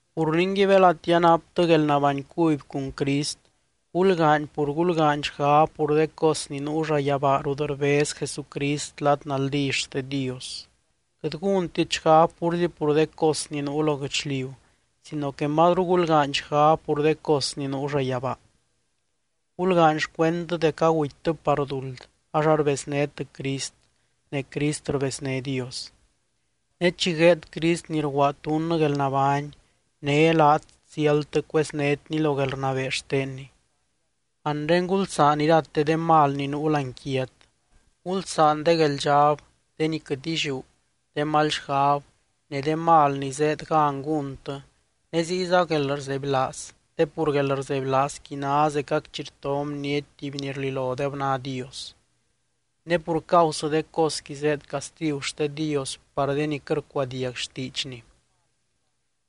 Pur ningui, belati anaptɨ guelnabány cuby cun Crist, gulgaany pur gulgaany xgab pur de cos ni nuu llayabaa rut rbez Jesucrist lad naldí xte Dios. Quɨt gúntit xgab púrzi pur de cos ni nuu lo guɨchliu sino que mazru gulgaany xgab pur de cos ni nuu llayabaa. Gulgaany xcuendtɨ dec agutytɨ par duld ax arbeznét Crist ne Crist rbezné Dios. Ne chi gueed Crist ni rguaad dunnɨ guelnabány, né laat ziáldtɨ cueznétny lo guelrnabee xtenny. Anre gulsaan irate de mal ni nuu láani quiat. Gulsaan de gueldxab, de ni quɨt illiú, de mal xgab, ne de mal ni zéed gan gúntɨ ne ziyza guelrzebylaaz te pur guelrzebylaazqui ná zecac chi rto bniety tuby ni rlilodeb ná Dios. Ne pur causɨ de cosqui zéed castigu xte Dios par de ni quɨt rcuadiag xtiidxny.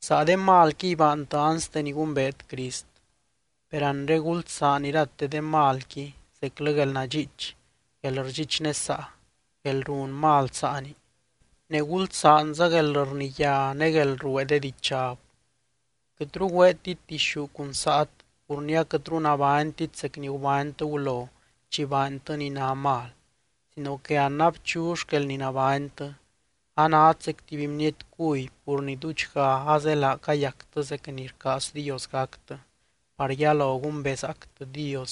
Saa de malquiy baantɨ anste ni gumbeet Crist. Per anre gulsaan irate de malqui zeclɨ guelnadxiich, guelrdxichnesaa, guelrun mal saani, ne gulsaanza guelrniyá ne guelruee de dichab. Quɨtru güeetit dixú cun saat pur ni aquɨtru nabánytit zec ni gubánytɨ gulo chi baantɨ ni ná mal sino que an abchu xquel ni nabánytɨ. Anát zec tuby bniety cuby pur ni duudxga azelaa cayactɨ zec ni rcaaz Dios gactɨ, par yalo gumbezaactɨ Dios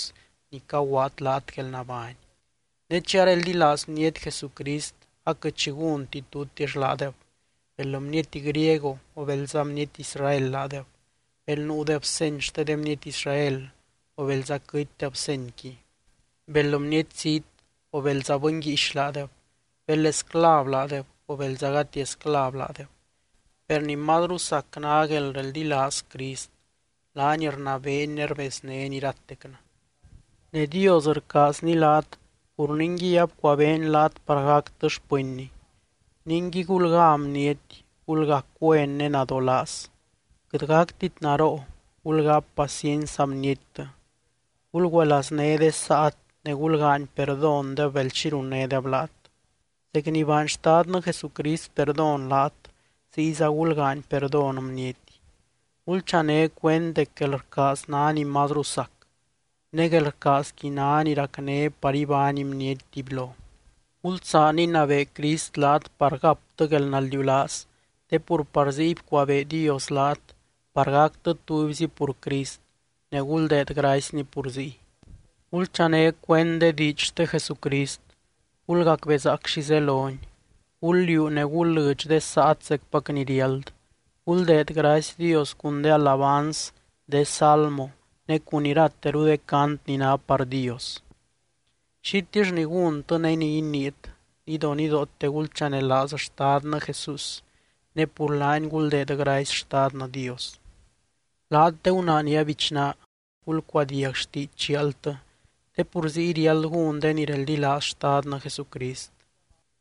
ni caguaad laat guelnabány. Ne chi areldilaaz bniety Jesucrist aquɨt xi gúnti tutix laadeb, bel bniety griego o belza bniety Israel laadeb, bel nuudeb seny xte de bniety Israel o belza quɨtydeb senyqui, bel bniety zít o belza bɨny guíix laadeb, bel esclav laadeb o belza gati esclav laadeb. Per ni mazru sac ná guelreldilaaz Crist, laany rnabeeny ne rbeznény iratecnɨ. Ne Dios rcaazny laat pur ningui abcuabeeny laat par gactɨ xpɨnny. Ningui gulgá bniety, gulgac güen ne nadolaaz. Quɨt gactit naroo, gulgáp paciency saa bniettɨ. Gulgüelazné de saat ne gulgaany perdóndeb bel xi runnédeb laat. Zec ni baany Xtadnɨ Jesucrist perdón laat ziyza gulgaany perdón bniety. Gulchané cuend dec guelrcaaz ná ni mazru sac. Ne guelrcaazqui ná ni racné par ibány bniety tubylo. Gulsaan inabee Crist laat par gaptɨ guelnaldiulaaz te pur par ziy bcuabee Dios laat par gactɨ tubyzi pur Crist, ne guldeed gracyny pur ziy. Gulchané cuend de diidx xte Jesucrist, gulgacbezaac xi zeloni. Gul liuu ne gul lɨdx de saat zecpac ni riáld. Guldeed gracy Dios cun de alabanz, de salmo ne cun irateru de cant ni ná par Dios. Xitill ni gúntɨ ne ni iniit, nidonidoote gulchanelaaz Xtadnɨ Jesús ne pur laany guldeed gracy Xtadnɨ Dios. Laat de gunaa ni abichná, gulcuadiag xtiidx chialtɨ te pur ziy riáld gún de ni reldilaaz Xtadnɨ Jesucrist.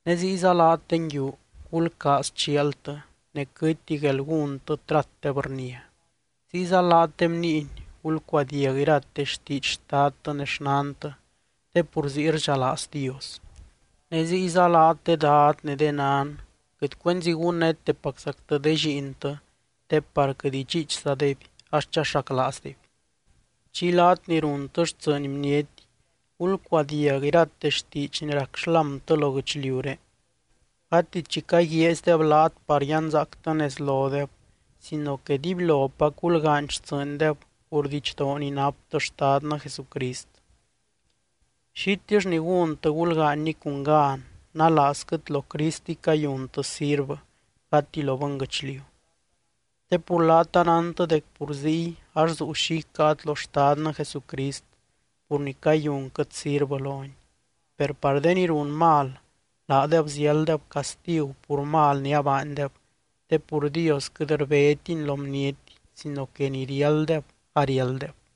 Ne ziyza laat de nguiu, gulcaaz chialtɨ ne quɨtti guelgúntɨ tratdeb rnia. Ziyza laat de bniiny, gulcuadiag irate xtiidx xtadtɨ ne xnantɨ te pur ziy rdxalaaz Dios. Ne ziyza laat de dad ne de nan, quɨt cuenzi gunnétepaczactɨ de lliintɨ te par quɨt idxiichzadeby ax chaxaclaazdeby. Chiy laat ni runtɨ xtsɨɨny bniety, gulcuadiag irate xtiidx ni rac xlámtɨ lo guɨchliuré. Gati chi caguiaazydeb laat par yanzaactɨ nez lodeb sino que dibylopac gulgaany xtsɨɨndeb pur didxdoo ni naptɨ Xtadnɨ Jesucrist. Xitill ni gúntɨ gulgaanyni cun gan nalaazquɨt lo Cristiy cayuntɨ sirvɨ gati lo bɨnguɨchliu. Te pur laat anántɨ dec pur ziy ax zuu xi icáat lo Xtadnɨ Jesucrist pur ni cayunquɨt sirvɨ lony. Per par de ni run mal, laadeb ziálddeb castigu pur mal ni abaandeb te pur Dios quɨt rbétiny lo bniety sino que ni riálddeb ariálddeb.